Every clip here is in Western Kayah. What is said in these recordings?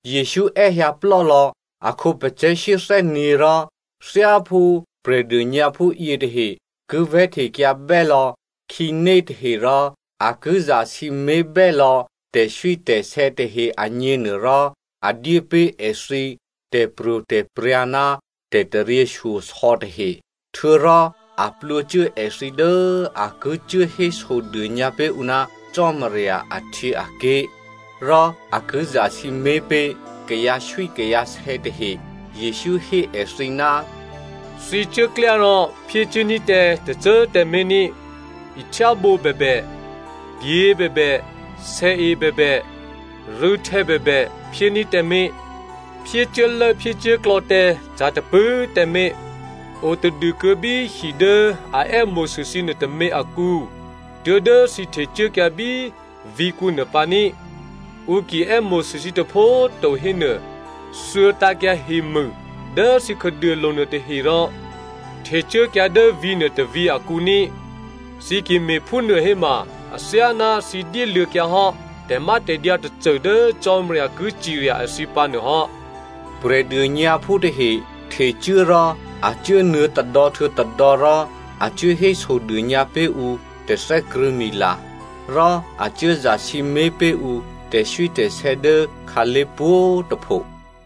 Jesǔ è́hyǎ plò́lò̌ a khǒpacè̤̌ shyéthè́nyě̤ rò thyáphú prè̤dônyǎphú yětahe ki vè̤́htekyǎbè́ lò̌ khǐnétahe rò a ki zasǐmé̤bè́ lò̌ tè̤swítè̤sè̌ tahe agněnuôrò, a dyé pé̤ èthǐ tè̤pro̤tè̤prya̤ ná tè̤taryěshyosò̌ tahe. Htuô̌rò a plwǒcuố èthǐ dố a ki cuố hésodônyǎ pé̤ ǔ ná Cò́marya ahtyěaké̤, rò a ki zasǐmé̤ pé̤ kayǎswíkayǎsè̌ tahe. Jesǔ hé èthǐ, “Thǐ cuốklyá rò phyécuốní̤ tǎ tôcô꤮ tǎmé̤ ní꤮, ihtyábǒ bèbè, pyě̤ bèbè, sèe bèbè, rû̌htè̌ bèbè phyéní̤ tǎmé̤. Phyécuốlốphyécuốklò̌ tǎ ca̤ tôpṳ̂꤮ tǎmé̤. Otadûkuô̌ bí hi dố a è́mo̤sû thǐ nuôtômě akǔ tuố̤dố thǐ htecuốkyǎ bí vǐ̤kǔnuô pǎní꤮. Ǔ ki è́mo̤sû thǐ tôpho꤮ to hénuô, thuô̌tǎ̤kyǎ hemû dố thǐ khǎduôlo̤ nuôtahe rò htecuốkyǎ dố vǐ̤nuô tôvǐ̤ akǔ ní꤮. Thǐ ki me̤phúnuô héma athyáná thǐ dyéluô̌kyǎhò́ tè̤mátè̤dyǎ tôcô dố Cò́marya ki cirya èthǐ pǎ nuôhò́.” Prè̤dônyǎphú tahe htecuố rò a cuốnuô̌ tôdò̌ htuô̌ tôdò̌ rò a cuố hésodônyǎ pé̤ ǔ tè̤thè́krṳ̂̌mila, rò a cuố zasǐmé̤ pé̤ ǔ tè̤swítè̤sè̌ dố khǎlé̤ pwǒ̤꤮ tôpho.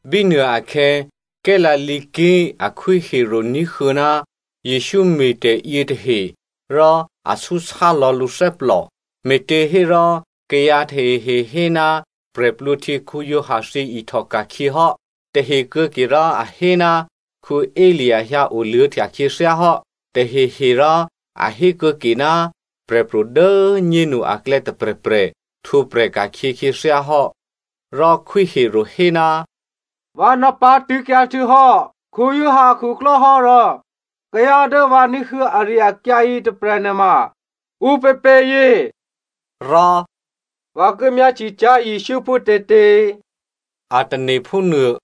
Bínuôakhè̌ Galilea ké̤ a Khwí Herodè ní̤huô̌ ná Jesǔ me̤tè̤ yětahe, rò a súsá lò̌ lǔ thè́plò, me̤těhérò, kayǎ tahehe hé ná Giovanni Baptista thyěihtòka̤khyě hò́. Tahe kuô̌ke rò a hé ná Elia hyǎoluô̌htya khyěthyáhò́, tahehe rò a hé kuô̌ke ná prè̤pro̤ dố꤮ nyénu aklè̌ tôprè̤prè̤ htwǒprè̤ ka̤khyě khyěthyá hò́. Rò Khwí Herodè hé, “Vǎ nò̌pǎ̤tṳ̂̌kyǎ htuô̌hò́ Giovanni akhuklò́ hò́ rò kayǎ dố vǎ ní̤huô̌ ari-akyǎ yětôprè̤ nuôma ǔpěpě è̌?” Rò, “Vǎ ki myáhtye cyá̤ Jesǔ phútětě,” a tane̤ phúnuô.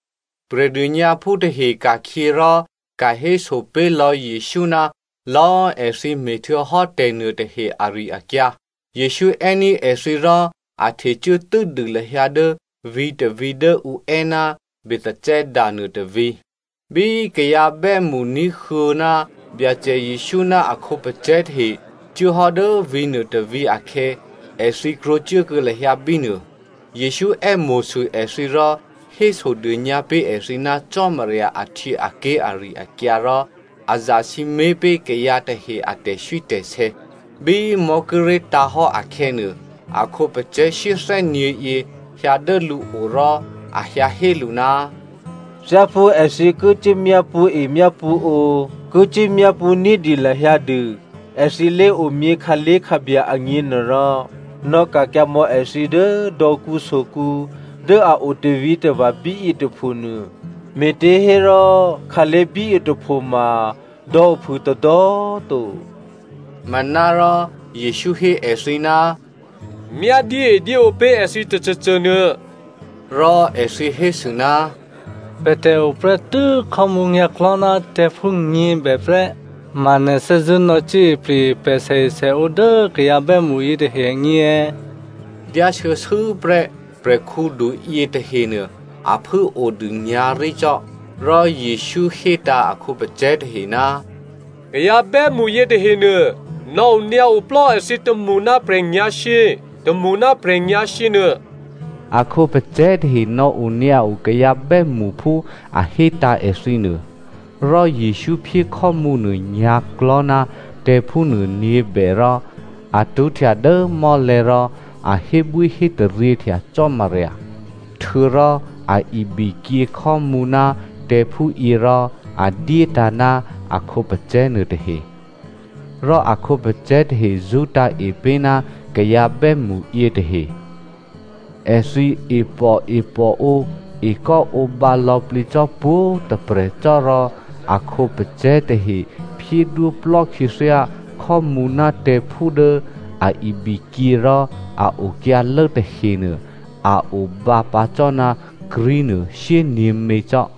Prè̤dônyǎphú tahe ka̤khyě rò ka̤héso pé̤lò̌ Jesǔ ná lò̌꤮ èthǐ me̤htuô̌hò́ tè̤nuôtahe ari-akyǎ. Jesǔ è́ní̤ èthǐ rò a htecuố tû́dû lahyǎ dố vǐ̤tôvǐ̤ dố ǔ è́ ná Bethsaida nuôtôvǐ̤. Bí kayǎ bè́mṳ ní̤huô̌ ná Byacè Jesǔ ná a khǒpacè̤̌ tahe cuốhò́ dố vǐ̤ nuôtôvǐ̤ akhè̌, èthǐ krwǒcuốkuô̌ lahyǎ bínuô. Jesǔ è́mo̤sû èthǐ rò hésodônyǎ pé̤ èthǐ ná Cò́marya ahtyěaké̤ ari-akyǎ rò a zasǐmé̤ pé̤ kayǎ tahe a tè̤swítè̤sè̌. Bí mò̤́ kíré̤ tǎ̤ hò́ akhè̌nuô, a khǒpacè̤̌ shyéthè́nyě̤yě hyǎ dố lǔo rò a hyǎhé lǔ, “Thyáphú èthǐ ki cuố myápṳ̌e myápṳ̌ǒ, ki cuốmyápṳ̌ ní̤dyé lahyǎ dû èthǐ lé̤omyě khǎlé̤khǎbya agněnuôrò, nò̌ka̤kyǎ mò̌ èthǐ dố dò̌kǔsokǔ dố a o tavǐtava̤ bíyě tôpho nuô, me̤těhérò khǎlé̤ bíyětôphoma dò̌ ophû tôdò̌꤮ to.” Manárò Jesǔ hé èthǐ, “Myá dyéedyéǒ pé̤ èthǐ tôcôcô nuô.” Rò èthǐ hésû, “Pè̤tè̤ o prè́tû́ khò́mǔ nyǎ̤klò̤́ ná tè̤̌phú nyě̤bè prè́. Ma nè̤ thè́zṳ̂́ nò̌ cuốipri̤ pè̤ sèesèǒ dố kayǎ bè́mṳ yětahe agně è̌?” Dyáshuô̌shuô̌prè́ prè̤khǔdu yětahenuô a phû꤮ odû nyǎ̤rí cò́. Rò Jesǔ hétǎ̤ a khǒpacè̤̌ tahe, “Kayǎ bè́mṳ yětahenuô, nò̌onyǎ oplò́ èthǐ tômṳ ná prè̤nyǎ̤shyě, tômṳ ná prè̤nyǎ̤shyě nuô.” A khǒpacè̤̌ tahe nò̌onyǎo kayǎ bè́mṳ phú a hétǎ̤ èthǐ nuô. Rò Jesǔ phyé khò́mǔnuô nyǎ̤klò̤́ ná tè̤̌phúnuô nyě̤bè rò a tṳ́htya dố mò́lè̤̌ rò a hébwíhétaryěhtya Cò́marya. Htuô̌rò a ibikyě khò́mǔ ná tè̤̌phúyě rò a dyétǎ̤ ná a khǒpacè̤̌ nuôtahe. Rò a khǒpacè̤̌ tahe zṳ́tǎ̤e pé̤ ná kayǎ bè́mṳ yětahe. Èthǐ e pòepòǒ ekò́ǒbǎ lò̌plǐ cò́ pwǒ̤꤮ tôprè̤ cò́ rò a khǒpacè̤̌ tahe phyédwóplò́ khyěthyá khò́mǔ ná tè̤̌phú dố a ibikyě rò a okyǎlố tahenuô a obǎ pǎ cò́ ná krí̤nuô shyényě̤mě cò́.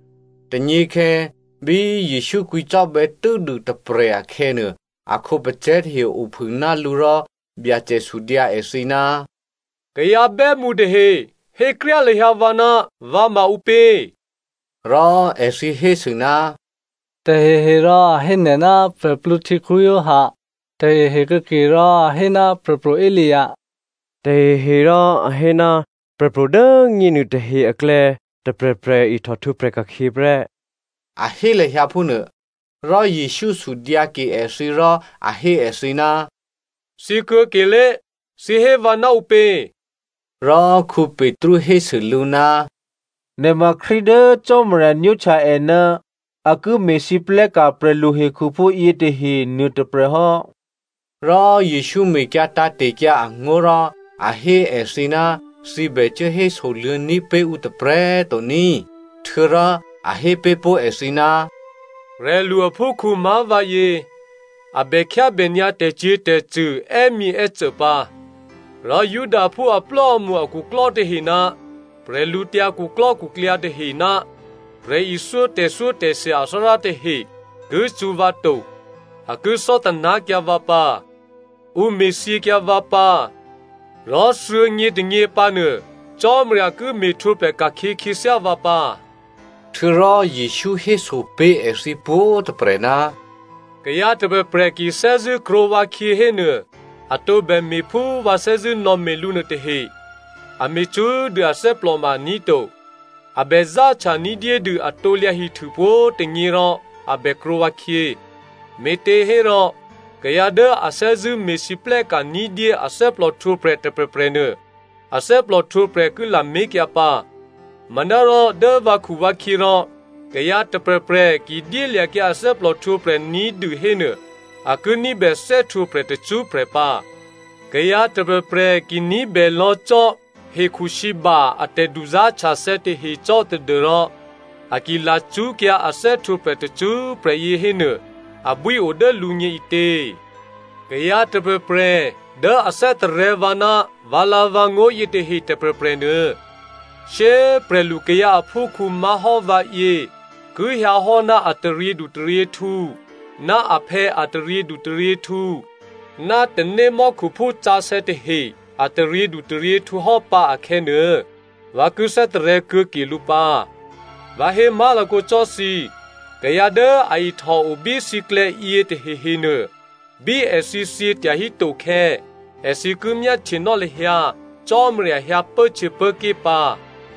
Tônyěkhè̌ bí Jesǔ kwǐcò́bè̌ tû́dû tôprè̤ akhè̌nuô, a khǒpacè̤̌ tahe ophû ná lǔ rò Byacè sudyǎ èthǐ, “Kayǎ bè́mṳ tahe hékryá lahyǎ vǎ ná vǎ maǔpě?” Rò èthǐ hésû, “Taheherò a hé nè̤ ná Giovanni Baptista, tahehe kuô̌kerò a hé ná Prè̤pro̤ Elia, taheherò a hé ná prè̤pro̤ dố꤮ nyénu tahe aklè̌ tôprè̤prè̤ ihtòhtwǒprè̤ ka̤khyě prè́,” a hé lahyǎ phúnuô. Rò Jesǔ sudyǎke èthǐ, rò a hé èthǐ, “Thǐ kuô̌kelé꤮, thǐ hé vǎ ná ǔpě?” Rò Petru hésû lǔ, “Nè̤ ma Krístu dố Cò́marya nwóhtya è ná a ki me̤lwóhteka̤ prè̤luhekhuphú yětahe nuôtôprè̤ hò́.” Rò Jesǔ mekyǎ tǎ̤te̤kyǎ angó̤ rò a hé èthǐ ná thǐ bè cuố hésoluô̌ní̤ pé̤ ǔ tôprè̤꤮ to ní꤮. Htuô̌rò a hé pé̤ pó̤ èthǐ, “Prè̤lu aphúkhǔ má̤ vǎyě, a bè khyábè nyǎ tè̤cyě̤tè̤cṳ̂ è́myěè́cô pǎ, rò Judaphú aplò́amṳ akhuklò́ tahe ná bwídukhu tahe ná prè̤ithyó tè̤thyótè̤thya athárá tahe ki cṳ̌ vǎ to, a ki thò́taná̤kyǎ vǎ pǎ. Ǔ me̤thyěkyǎ vǎ pǎ rò thuô̌nyětônyě pǎnuô Cò́marya ki me̤htwǒprè̤ ka̤khyě khyěthyá vǎ pǎ.” Htuô̌rò Jesǔ héso pé̤ èthǐ pwǒ̤꤮ tôprè̤, “Kayǎ tôprè̤prè̤ ki thè́zṳ̂́ krwǒ vǎkhyě hénuô, a tǒbè me̤ phú vǎ thè́zṳ̂́nò̌me̤ lǔ nuôtahe, a me̤ cṳ́꤮ dû athè́plò ma aní̤ to. A bè záhtya ní̤dyédû a krusu pwǒ̤꤮ tônyě rò a bè krwǒ vǎkhyě. Me̤těhérò kayǎ dố a thè́zṳ̂́ me̤lwóhteka̤ ní̤dyé a thè́plòhtwǒprè̤ tôprè̤prè̤ nuô, a thè́plòhtwǒprè̤ ki lamé̤kyǎ pǎ. Manárò dố vǎkhuvǎkhyě rò kayǎ tôprè̤prè̤ ki dyélya̤kyǎ a thè́plòhtwǒprè̤ ní̤dû hénuô, a ki ní̤bè thè́htwǒprè̤ tacṳ́prè̤ pǎ. Kayǎ tôprè̤prè̤ ki ní̤bè lò̌ cò́ hekhusǐba a tè̤duzá̤htyathè̌ tahe cò́ tadû́rò a ki lacṳ́kyǎ a thè́htwǒprè̤ tacṳ́prè̤ yě hénuô abwío dố lǔgně ǐtě? Kayǎ tôprè̤prè̤ dố a thè́tarè̤̌ vǎ ná vǎlǎ̤vǎngó̤ yětahe tôprè̤prè̤ nuô, shyé꤮ prè̤lukayǎ aphúkhǔ má̤hò́ vǎyě ki hyǎhò́ ná a taryědutaryěhtǔ ná aphè̌ a taryědutaryěhtǔ ná tanémò́khuphú sǎsè̌ tahe a taryědutaryěhtǔ hò́pǎ akhè̌nuô, vǎ ki thè́tarè̤̌ kuô̌ke lǔ pǎ. Vǎ hé má̤lakǒ cò́ thǐ, kayǎ dố a ihtòo bí thǐklè̌yě tahehenuô, bí èthǐ thyě tyahí tokhè̌, èthǐ ki myáhtyenò́ lahyǎ Cò́marya hyǎ pốhtyěpốké̤ pǎ.”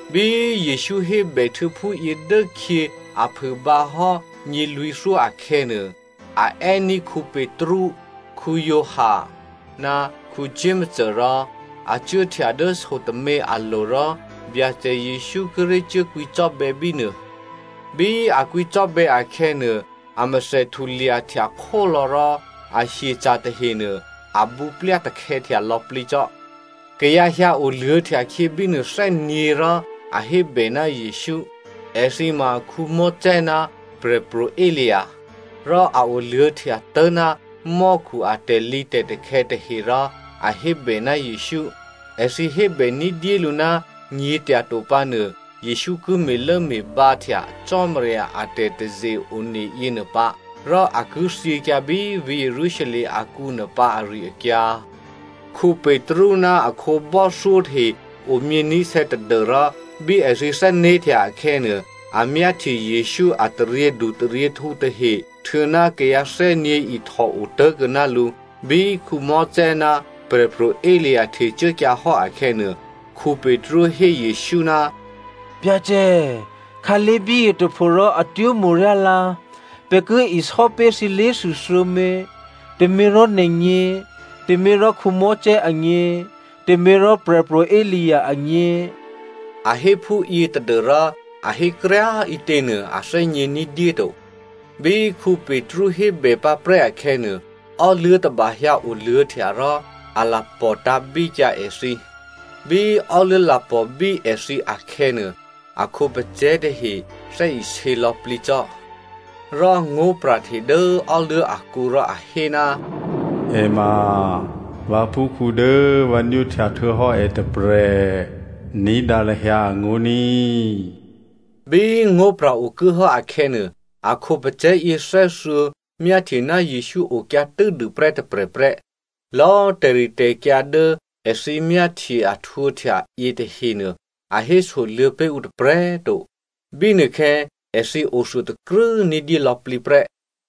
Bí Jesǔ hébèhtuô̌ phúyě dốkhyě a phû bǎhò́ nyělwǐ̤thyó akhè̌nuô, a è́ní̤ Petru, Giovanni ná Jakomo rò a cuốhtya dố so tômě alo̤ rò Byacè Jesǔ kíré̤ cuốkwǐcò́bè̌ bínuô. Bí a kwǐcò́bè̌ akhè̌nuô, amèthè htulyahtya khólò̌ rò a hyeca̤ tahenuô abǔplyatakhè̌htya lò̌plǐ cò́. Kayǎ hyǎ oluô̌htyakhyé bínuô thè́nyě̤ rò a hébè ná Jesǔ. Èthǐ ma Mosè ná Prè̤pro̤ Elia. Rò a oluô̌htya tố̤ ná mò́khu a tè̤lǐtè̤takhè̌ tahe rò a hébè ná Jesǔ. Èthǐ hébè ní̤dyélǔ ná nyě̤tyato pǎnuô Jesǔ ki me̤lốme̤bǎhtya Cò́marya a tè̤taze-one yěnuô pǎ, rò a ki thyěkyǎ bí vǐ̤ Jerusalem akǔnuô pǎ ari-akyǎ. Petru ná a khǒbò́thyó tahe omyění̤sè̌ tadû́rò bí èthǐ thè́né̤htya akhè̌nuô, a myáhtye Jesǔ a taryědutaryěhtǔ tahe htuô̌ná kayǎ thè́nyě̤ ihtò otố̤kuô̌ ná lǔ. Bí Mosè ná Prè̤pro̤ Elia htecuốkyǎ hò́ akhè̌nuô, Petru hé Jesǔ, “Byacè꤮, khǎlé̤ bíyě tôpho rò atwó̤ mo̤ryá lǎ. Pè̤ ki isò́pé̤ thǐ lé̤thû thuô̌mě, tôměrò nè̤gně, tôměrò Mosè agně, tôměrò Prè̤pro̤ Elia agně.” (A hé phúyě tadû́rò a hékryá꤮ ǐtěnuô a thè́gně ní̤dyé to.) Bí Petru hébè pǎprè́ akhè̌nuô, ò́luố̤ tôba hyǎ oluô̌htya rò a lapò̤ tǎ̤bíkyǎ èthǐ. Bí ò́luố̤ lapò̤bí èthǐ akhè̌nuô, a khǒpacè̤̌ tahe thè́isě lò̌plǐ cò́. Rò ngó̤pra̤hte dố ò́luố̤ akǔ rò a hé, “È ma vǎphúkhǔ dố vǎ nwóhtya htuô̌hò́ è tôprè̤. Ní̤dǎ lahyǎ angó̤ ní꤮.” Bí ngó̤pra̤ okuốhò́ akhè̌nuô, a khǒpacè̤̌ yěthè́thuô̌ myáhtye ná Jesǔ okyǎ tû́dûprè́ tôprè̤ prè́. Lò̌꤮ tè̤ritè̤kyǎ dố èthǐ myáhtye a htwǒhtya yětahenuô a hésoluô̌ pé̤ ǔ tôprè̤꤮ to, bínuôkhè̌ èthǐ othuôtakrû́ ní̤dyé lò̌plǐ prè́.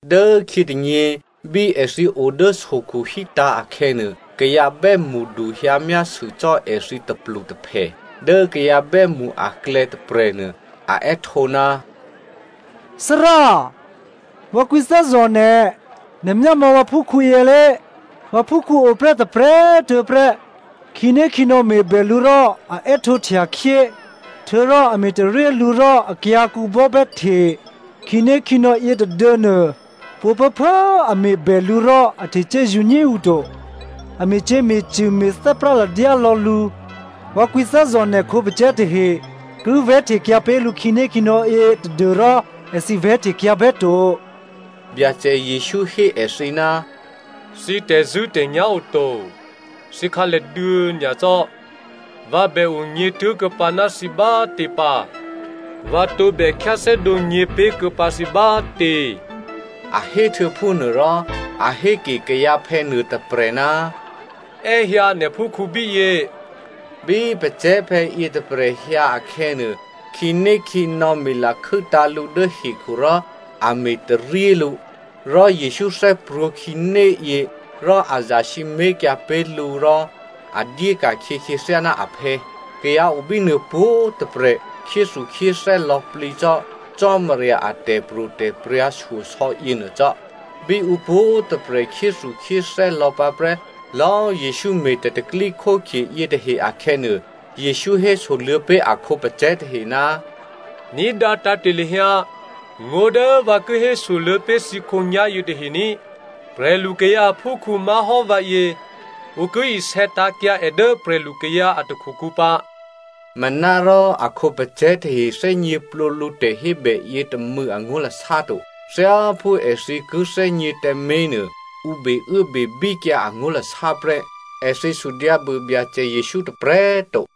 Dốkhyětônyě, bí èthǐ o dố sokhu hítǎ̤ akhè̌nuô, kayǎ bè́mṳdu hyǎmyásû cò́ èthǐ tôplutôphè. Dố kayǎ bè́mṳ aklè̌ tôprè̤nuô a è́htǒ, “Thárá꤮! Vǎ kwǐthè́zò̤ nè̤, nè̤ myámò̌ vǎphúkhǔ yělé. Vǎphúkhǔ oprè́ tôprè̤꤮ tuô̌ prè́. Khǐnékhǐnò̌ me̤bè lǔ rò a è́htǒhtyakhyé. Htuô̌rò a me̤taryé lǔ rò akyǎ̤kǔ bò́bè́hte. Khǐnékhǐnò̌ yětôduô̌nuô, pwǒ̤phuốphuố꤮ a me̤bè lǔ rò a htecuố zǔnyé to, a me̤cyě̤me̤cṳ̂ me̤ thè́práladyá lò̌ lǔ. Vǎ kwǐthè́zò̤ nè̤ khǒpacè̤̌ tahe ki vè̤́htekyǎ pé̤ lǔ khǐnékhǐnò̌yě tadû́rò èthǐ vè̤́htekyǎ bè́to.” Byacè Jesǔ hé èthǐ, “Thǐ tè̤zṳ̂́tè̤nyá̤ oto, thǐ khǎlèduô̌ nyacò́! Vǎ bè onyě̤ tố̤kuô̌pǎ ná thǐ bátě pǎ? Vǎ tǒbè khyáthè́dǒ nyě̤pé̤kuô̌pǎ thǐ bátě?” A héhtuô̌ phúnuôrò a héke kayǎphè̌ nuôtôprè̤, “È́hyǎ nè̤ phúkhǔ bíyě.” Bí pacè̤̌phè̌ yětôprè̤ hyǎ akhè̌nuô, khǐnékhǐnò̌ me̤lakhû́tǎ̤ lǔ dố hekhu rò a me̤taryé lǔ. Rò Jesǔ thè́prwǒ̤ khǐnéyě, rò a zasǐmé̤kyǎ pé̤ lǔ, rò a dyéka̤khyě khyěthyá ná aphè̌. Kayǎ o bínuô pwǒ̤꤮ tôprè̤ khyéthukhyéthè́ lò̌plǐ cò́ Cò́marya a tè̤pro̤tè̤prya̤ shyosò̌ yěnuô cò́. Bí ǔ pwǒ̤꤮ tôprè̤ khyéthukhyéthè́ lò̌pǎprè́ lò̌꤮ Jesǔ me̤ tè̤pro̤tè̤prya̤ yětahe akhè̌nuô, Jesǔ hésoluô̌ pé̤ a khǒpacè̤̌ tahe, “Ní̤dǎ tǎ̤te̤ lahyǎ ngó̤ dố vǎ ki hésoluô̌ pé̤ thǐ khǒnyá̤ yětahe ní꤮. Prè̤lukayǎ aphúkhǔ má̤hò́ vǎyě, ǔ ki isè̌ tǎ̤kyǎ è dố prè̤lukayǎ a takhukǔ pǎ.” Manárò a khǒpacè̤̌ tahe thè́gněplǒ lǔ tè̤hébè yětômû̌ angó̤lasá to. Thyáphú èthǐ ki thè́gně tǎmé̤ nuô, ǔ beuốbebíkyǎ angó̤lasá prè́. Èthǐ sudyǎbû Byacè Jesǔ tôprè̤꤮ to.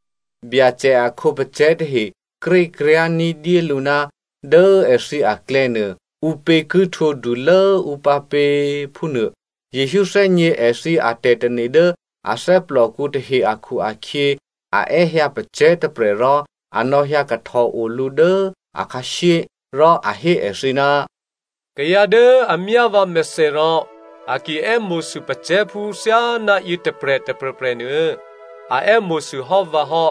Byacè a khǒpacè̤̌ tahe krékryá̤ ní̤dyélǔ ná dố èthǐ aklè̌nuô, ǔpě ki htwǒdulố ǔ pǎpě, phúnuô. Jesǔ thè́gně èthǐ atè̤tane̤ dố a thè́plòkǔ tahe akhu-akhyě a è́hyǎ pacè̤̌ tôprè̤ rò a nò̌hyǎ kahtòo lǔ dố akhǎshyé, rò a hé èthǐ, “Kayǎ dố a myá vǎmèthè rò a ki è́mo̤sû pacè̤̌phú thyáná yětôprè̤ tôprè̤prè̤nuô a è́mo̤sû hò́ vǎ hò́.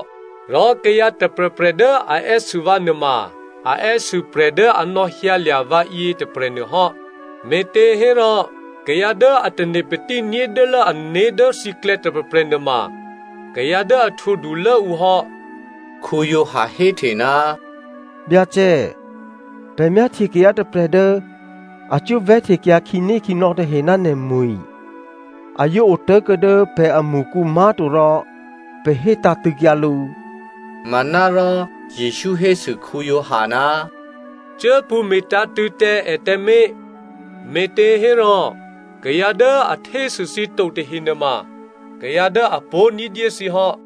Rò kayǎ tôprè̤prè̤ dố a è́sû vǎ nuôma a è́sû prè̤ dố a nò̌hyǎlya̤ vǎ yětôprè̤nuô hò́. Me̤těhérò, kayǎ dố a tane̤patí ní̤dyélố ané̤ dố thǐklè̌ tôprè̤prè̤ nuôma kayǎ dố a htwǒdulố ǔ hò́.” Giovanni héhte, “Byacè꤮ pè̤ myáhtye kayǎ tôprè̤ dố a cuố vè̤́htekyǎ khǐnékhǐnò̌ tahe ná nè̤mwi̤. A yǒ otố̤kuô̌ dố pè̤amṳkǔ má̤to rò pè̤ hé tǎ̤tṳ̂̌kyǎ lǔ.” Manárò Jesǔ hésû Giovanni, “Cuốpṳ̌ me̤tǎ̤tṳ̂̌ tǎ è tǎmé̤. Me̤těhérò kayǎ dố a htésû thǐ to tahe nuôma kayǎ dố a pó̤ ní̤dyé thǐ hò́.”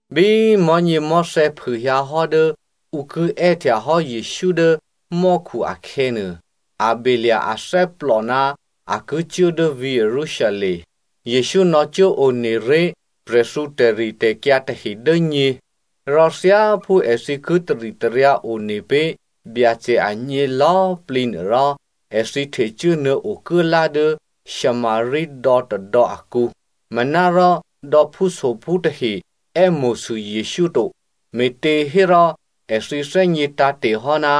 Bí mò̤́nyěmò̤́thè̌ phûhyǎhò́ dố ǔ ki è́htyahò́ Jesǔ dố mò́khu akhè̌nuô, a belya̤ athè́plò ná a ki cuố dố vǐ̤ Jerusalem. Jesǔ nò̌cuốone ré̤ prè̤thǔ tè̤ritè̤kyǎ tahe dố nyě, rò thyáphú èthǐ ki taritaryǎ one pé̤ Byacè agně lò̌꤮ plǐ nuôrò, èthǐ htecuố nuô̌ okuốlá dố Samaria dò̌tôdò̌ akǔ. Manárò dò̌phúsophú tahe è́mo̤sû Jesǔ to, me̤těhérò èthǐ thè́gně tǎ̤te̤hò́ ná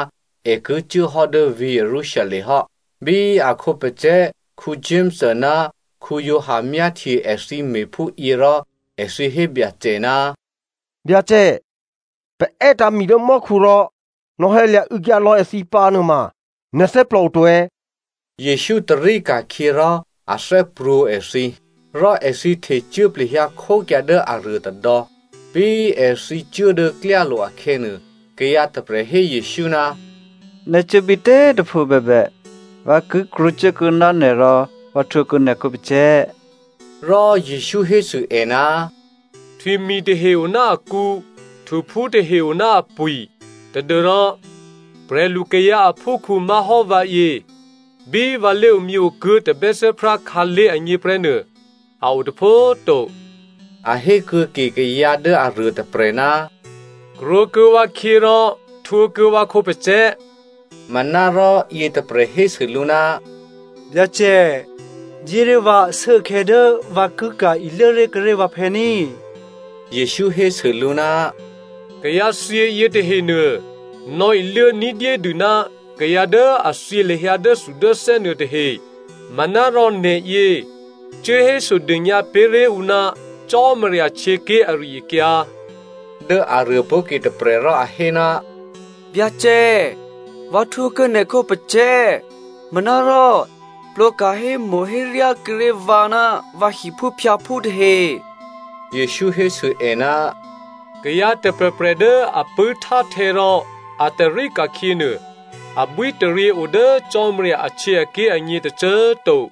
è ki cuố hò́ dố vǐ̤ Jerusalem hò́. Bí a khǒpacè̤̌ Jakomo ná Giovanni myáhtye èthǐ me̤phúyě rò, èthǐ hé Byacè, “Byacè, pè̤ è́tǎ̤ mi dố mò́khu rò nò̌hyǎlya̤ û̌kyǎ lò̌ èthǐ pǎ nuôma nè̤ thè́plò o to è̌?” Jesǔ tarí ka̤khyě rò a thè́prwǒ̤ èthǐ. Rò èthǐ htecuố plehyǎ khókyǎ dố aruô tôdò̌. Bí èthǐ cuố dố klyálo̤ akhè̌nuô, kayǎ tôprè̤ hé Jesǔ, “Nè̤ cuố bítě꤮ tôpho bèbè, vǎ ki krwǒcuốkuô̌ ná nè̤ rò vǎ htwǒkuô̌ nè̤ khǒpacè̤̌.” Rò Jesǔ hésû è, “Htwimi̤ tahe o ná akǔ, htuphú tahe o ná apwi̤, tadû́rò prè̤lukayǎ aphúkhǔ má̤hò́ vǎyě, bí vǎ lé̤omyě kuố tabè́thè́prá khǎlé̤ agně prè́nuô a o tôpho꤮ to.” A hé kuô̌ke kayǎ dố aruôtôprè̤, “Krwǒkuô̌ vǎkhyě rò htwǒkuô̌ vǎ khǒpacè̤̌.” Manárò yětôprè̤ hésû lǔ, “Byacè, dyéré̤ vǎ ashuốkhè̌ dố vǎ ki ka̤ iluốré̤ kuốré̤ vǎphè̌ ní꤮.” Jesǔ hésû lǔ, “Kayǎthyě yětahenuô, nò̌iluố ní̤dyédû ná kayǎ dố a thyě lahyǎ nuôtahe. Manárò nè̤yě, cuố hésodônyǎ pé̤ré̤ ǔ ná Cò́marya htyěké̤ ari-akyǎ.” Dố aruô pó̤ke tôprè̤ rò a hé, “Byacè꤮ vǎ htwǒkuô̌ nè̤ khǒpacè̤̌, manárò plwǒka̤ hémo̤héryá kuô̌ré̤ vǎ ná vǎ hiphúphyǎphú tahe.” Jesǔ hésû è, “Kayǎ tôprè̤prè̤ dố a pṳ̂́htáhtè̌ rò a tarí ka̤khyě nuô, abwítaryě o dố Cò́marya ahtyěaké̤ agně tôcô꤮ to.”